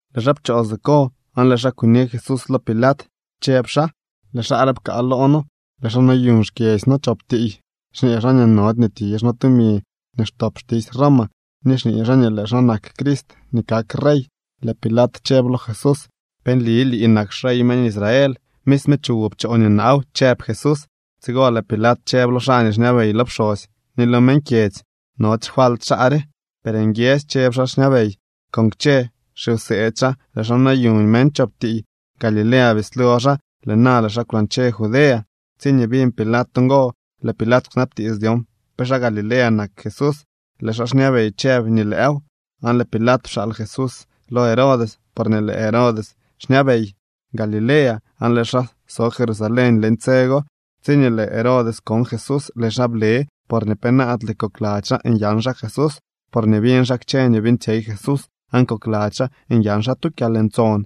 Lëë xaa pchoo siko aan lëë xaa kuni Jesús lo Pilat, chëb xaa: —Lëë xaa re pkaa loo noo. Lëë xaa noyuñ xkyedzy noo chop tiiy, xñee xaa nii nody nii tizh noo tumi nii xtop xtisy Roma, ni xñee xaa nii lëë xaa nak Crist nii kak rey. Lëë Pilat chëb lo Jesús: —¿Pe nli lii nak xrey meñ Israel? —Misme chuwoo pchoo nii naaw —chëb Jesús. Tsigo lëë Pilat chëb lo xaa nii xñabey lo pxosy ni lo meñ kyedzy: —Nody xfalt xaa re. Per nguiedzy chëb xaa xñabey: —Con kchë xiwseedy xaa lëë xaa noyuñ meñ chop tiiy. Galilea bislo xaa, lëë na lëë xaa kwlañche Judea. Tsiñee biñ Pilat ngo, lëë Pilat kwnabtiits dyon pe xaa Galilea nak Jesús. Lëë xaa xñabey chëb nii lëëw, aan lëë Pilat pxaal Jesús lo Herodes porñee lëë Herodes xñabey Galilea aan lëë xaa so Jerusalén leñ tse go. Tsiñee lëë Herodes kon Jesús, lëë xaa ble porñee penaadle kokladzy xaa nyan xaa Jesús, porñee biñ xaa kchë nii beeñtsyey Jesús aan kokladzy xaa nyan xaa tu kyalntson.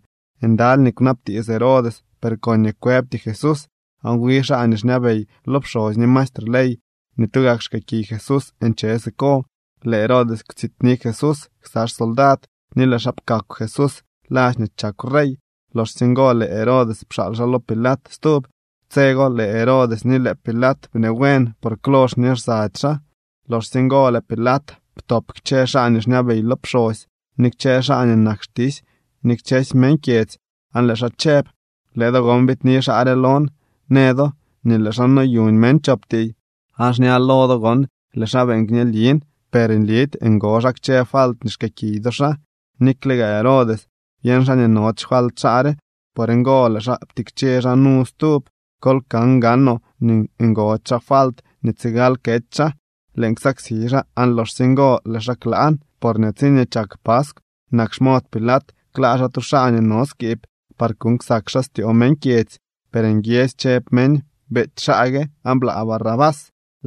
Ndaly nii kwnabtiits Herodes, per koñee kwëbty Jesús. Aan wi xaa nii xñabey lo pxosy ni maestre ley nii tugak xkëëkiy Jesús nche siko. Lëë Herodes kwtsityni Jesús ksa xsoldad ni lëë xaa pkakw Jesús ladx nii chakw rey. Loxsye ngo lëë Herodes pxaal xaa lo Pilat stub. Tse go lëë Herodes ni lëë Pilat bnee buen, por klo xñee lsady xaa. Loxsye ngo lëë Pilat ptop kchë xaa nii xñabey lo pxosy, ni kchë xaa nii nak xtisy ni kchësy meñ kyedzy. Aan lëë xaa chëb: —Lëë do gon biidni xaa re lon, në do nii lëë xaa noyuñ meñ chop tiiy. Aan xña lo do gon lëë xaa beeñ kñelin, per nlidy ngo xaa kchë falt nii xkëëkiy do xaa. Nikle gaa Herodes, byeñ xaa nii nody xfalt xaa re. Por ngo lëë xaa ptikche xaa nu stub. Kol kan gaanoo nii ngody xaa falt nii tsigal kety xaa. Lëën ksaksi xaa, aan loxsye ngo lëë xaa klaan. Porñee tsiñee chak paskw, nak xmod Pilat klaa xaa tu xaa nii no skiib par kuuñ ksak xaa styoo meñ kyedzy. Per nguiedzy chëb meñ: —¡Beety xaa gue, aan blaa Barrabás!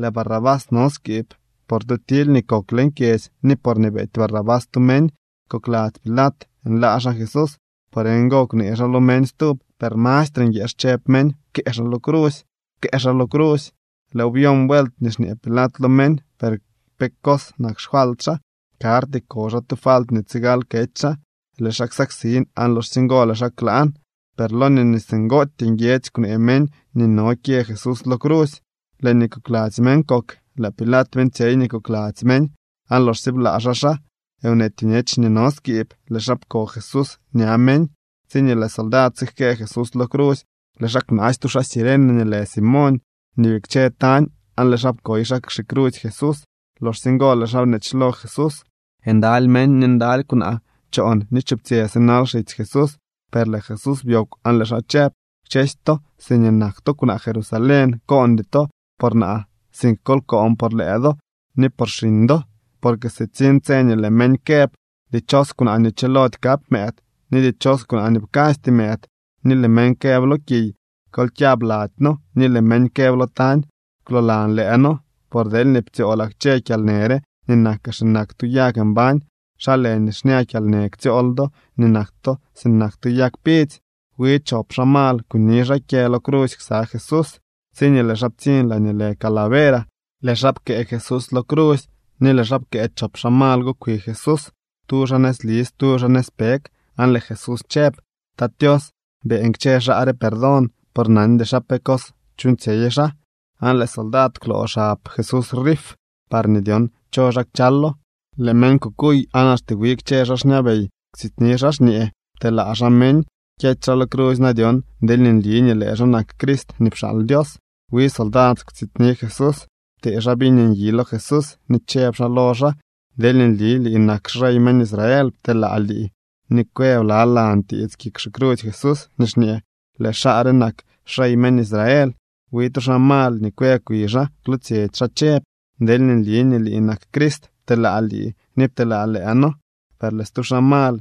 Lëë Barrabás no skiib por tu tily nii kok leñ kyedzy, ni porñee beety Barrabás tu meñ. Kokladzy Pilat nlaa xaa Jesús. Por ngo kwnee xaa lo meñ stub. Per mastre nguieex chëb meñ: —¡Pkëë xaa lo crusy! ¡Pkëë xaa lo crusy! Lëëw byon vuelt nii xñee Pilat lo meñ: —¿Per pe cos nak xfalt xaa? Karty ko xaa tu falt nii tsigal kety xaa. Lëë xaa ksaksin, aan loxsye ngo lëë xaa klaan. Per loñee singootyee nguiedzy kwnee meñ nii no nii kyë Jesús lo crusy, lëë nii kokladzy meñ kok. Lëë Pilat beeñtsyey nii kokladzy meñ. Aan loxsye blaa xaa xaa nweety bñech nii no skiib, lëë xaa pko Jesús ña meñ. Tsiñee lëë soldad sijkëë Jesús lo crusy, lëë xaa kwnaasy tu xaa Cirene nii lë Simoñ, nii bikche tañ, aan lëë xaa pkoy xaa xicrusy Jesús. Loxsye ngo lëë xaa bneechlo Jesús. Ndaly meñ ni ndaly kwnaa choon ni chuptsyë sinal xitsy Jesús. Per lëë Jesús byoogw, aan lëë xaa chëb: —Kchësy to siñee nak to kwnaa Jerusalén, koondy to por naa, sink kol koon por lëë do ni por xiñ do. Porque sitsiñ tse nii lëë meñ këb: “Dichos kwnaa nii chilody kap mëëd ni dichos kwnaa nii pkasty mëëd.” Ni lëë meñ këb lo kiy: “Kol kyab lady noo.” Ni lëë meñ këb lo tañ: “Kwloolan lëë noo.” Por deelñee ptsyoolaa kchë kyalnë re nii nakaa sinak tu yag mbañ, ¿xa lë nii xña kyalnë ktsyool do nii nak to sinak tu yag pidzy? Wi chop xaa mal kuni xaa kyë lo crusy ksa Jesús. Tsiñee lëë xaa ptsiñ laañee lë Calavera, lëë xaa pkëë Jesús lo crusy, ni lëë xaa pkëë chop xaa mal go kwi Jesús, tu xaa nëzli, stu xaa nëzpeg. Aan lëë Jesús chëb: —Tat Tios, beeñ kchë xaa re perdón, porque nandy xaa pe cos chuuñtsyey xaa. Aan lëë soldad kwloo xab Jesús rif parñee dyon cho xaa kchalo. Lëë meñ kukuy aan axte wi kchë xaa xñabey kwtsityni xaa xñee: —Pteelaa xaa meñ. Kyety xaa lo crusy na dyon deelñee nli nii lëë xaa nak Crist nii pxaal Dios. Wi soldad kwtsityni Jesús. Ptee xaa viñ nyi lo Jesús, ni chëb xaa lo xaa: —Deelñee nli lii nak xrey meñ Israel, pteelaa lii. Ni kwë blalan tiits kik xicrusy Jesús nii xñee: “Lëë xaa re nak xrey meñ Israel.” Wi tu xaa mal nii kwë kwi xaa kwlootsyetsy xaa chëb: —Deelñee nli nii lii nak Crist, pteelaa lii ni pteelaa lëë noo. Per lëë stu xaa mal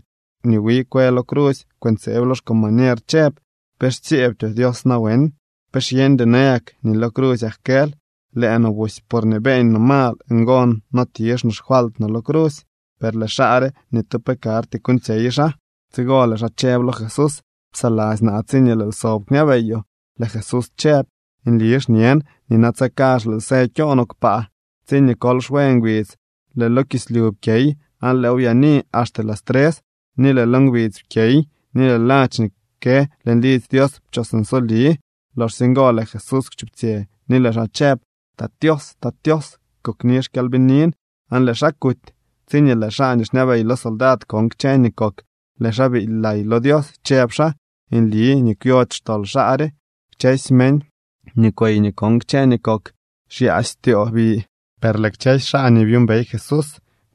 nii wi kë lo crusy kwëntseeb lo xcombañer chëb: —¿Pe xtsyeebtyoo Dios nawen? ¿Pe xyeñdyoo nayak nii lo crusyak kël? Lëë no busy porñee beeñ no mal ngo no tizh no xfalt no lo crusy. Per lëë xaa re, ni tu pe karty kuuñtsyey xaa. Tsigo lëë xaa chëb lo Jesús: —Psaladzy naa tsiñee lëël sob kñabeyoo. Lëë Jesús chëb: —Nli xñen nii natse kazh lëël së kyo no kpaa. Tsiñee kol xwe ngbidz lëë lo kislyu pkyey, aan lëëw byaani axte las tres. Ni lëë lo ngbidz pkyey ni lëë ladx nii kë leñ lidzy Dios pchos nsoli. Loxsye ngo lëë Jesús kwchuptsyë ni lëë xaa chëb: —Tat Tios, kokni xkyalbinin. Aan lëë xaa kuty. Tsiñee lëë xaa nii xñabey lo soldad kon kchë nii kok, lëë xaa biily lay lo Dios, chëb xaa: —Nli nii kwyody xtol xaa re. Kchësy meñ nii kwey ni kon kchë nii kok xyaasy styoo bi. Per lëë kchësy xaa nii byuumbey Jesús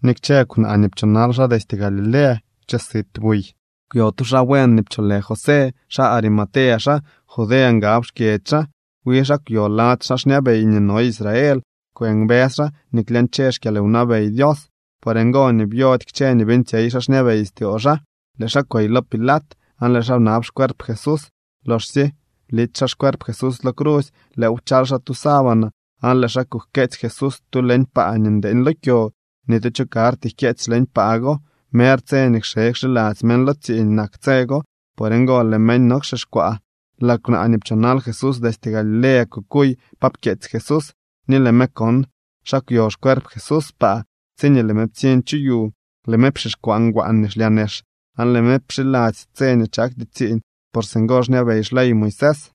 ni kchë kwnaa nii pchoonal xaa destye Galilea kwche sit buy. Kwyo tu xaa buen nii pcholë José. Xaa Arimatea xaa. Judea ngab xkyedzy xaa. Wi xaa kwyo lady xaa xñabey nii no Israel. Kwëmbës xaa nii klyañche xkyalwnabey Dios. Por ngo nii byody kchë nii beeñtsyey xaa xñabey styoo xaa. Lëë xaa kwey lo Pilat, aan lëë xaa bnab xcuerp Jesús. Loxsye blity xaa xcuerp Jesús lo crusy, lëëw pchal xaa tu sábana, aan lëë xaa kujkeetsy Jesús tu leñ paa nii ndeeñ lo kyo. Ni tu cho karty jkyeetsy leñ paa go. Mer tse nii kxe kxiladzy meñ lo tsiiñ nak tse go, por ngo lëë meñ nowxixkwaa. Lëë kwnaa nii pchoonal Jesús destye Galilea kukuy pa pkyeetsy Jesús, ni lëë me kon xa kwyo xcuerp Jesús paa. Tsiñee lëë me ptsiñ chu yu, lëë me pxixkwaa ngwaan nii xlyaa nex, aan lëë me pxiladzy tse nii chakty tsiiñ, por singo xñabey xley Moisés.